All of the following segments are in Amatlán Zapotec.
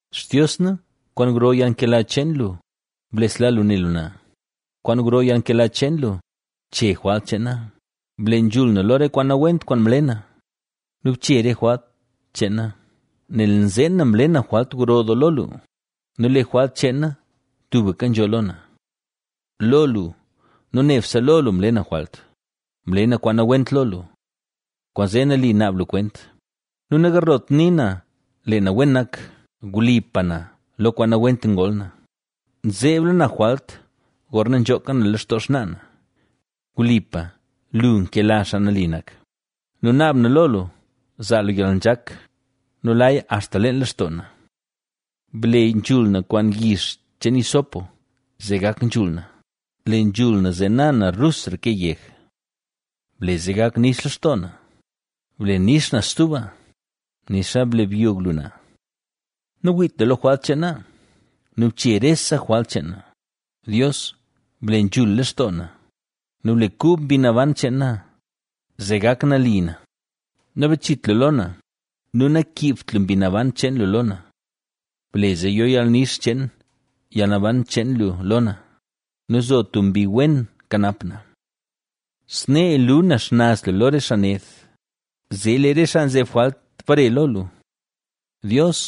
Xtios na, kwaan gro yalnkela cheen lu, blesla lu ne lu na; kwaan gro yalnkela cheen lu, che jwalt cheen na. ¡Ble nzhul na lo re kwaan nawent kwaan mle na nu bche re jwalt cheen na! Nel nzeen na mle na jwalt gro doo lo lu nu lee jwalt cheen na tubka nzho lo na. Lo lu, nu nebse lo lu, mle na jwalt, mle na kwaan nawent lo lu. Kwaanzee nali naab lu kwent nu nagarlot nii na lee na wen nak. Wlipa na, lo kwaan nawent ngol na, nzeebla na jwalt gorna nzhooka na lextoo xnaa na. Wlipa lu nkela xaa nali nak nu naab na lo lu zaa lu yalnzhak nu laya axta leen lextoo na. Ble nzhul na kwaan yix cheen hisopoa zee gak nzhul na; le nzhul na, zee na na rusra ke yeg. Ble zee gak nix lextoo na, ble nix na stuba, nixa mle byog lu na. Nawiit lu lo jwalt cheen na nu bche rese jwalt cheen na. Dios, ble nzhul lextoo na nu ble kub mbi naban cheen na, zee gak nali na, Nabachit lu lo na nu nakiibt lu Mbi Naban cheen lu lo na. Ble zee yo yalnix cheen yalnaban cheen lu lo na nu zo tub mbi wen kanap na. Snee lu na xnaz lu lo re xaa ned, zee lee re xaa nzeb jwalt bare lo lu. Dios,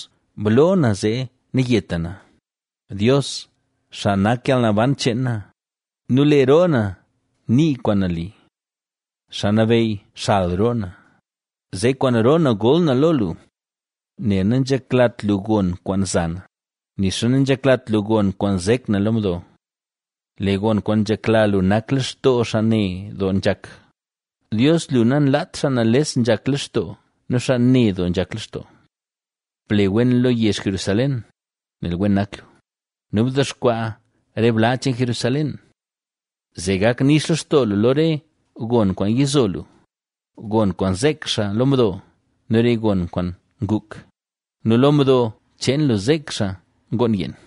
bloo na zee nayeta na, Dios, xaa nak yalnaban cheen na nu lee roo na nii kwaan nali. Xaa Nabeyy xal roo na, zee kwaan roo na gol na lo lu. Nel nanzheklat lu gon kwaan za na, nixa nanzheklat lu gon kwaan zek na mdo. Lee gon kwaan nzhekla lu nak lextoo xaa ne doo nzhak; Dios, lu nanlaat xaa nales nzhak lextoo nu xaa ne doo nzhak lextoo. Ble wen lo yezh Jerusalén, nel wen nak lu nu bdexkwaa re bla cheen Jerusalén. Zee gak nix lextoo lu lo re gon kwaan yizo lu, gon kwaan zeek xaa lo mdo nu re gon kwaan nguk nu lo mdo cheen lu zeek xaa ngoon yeen.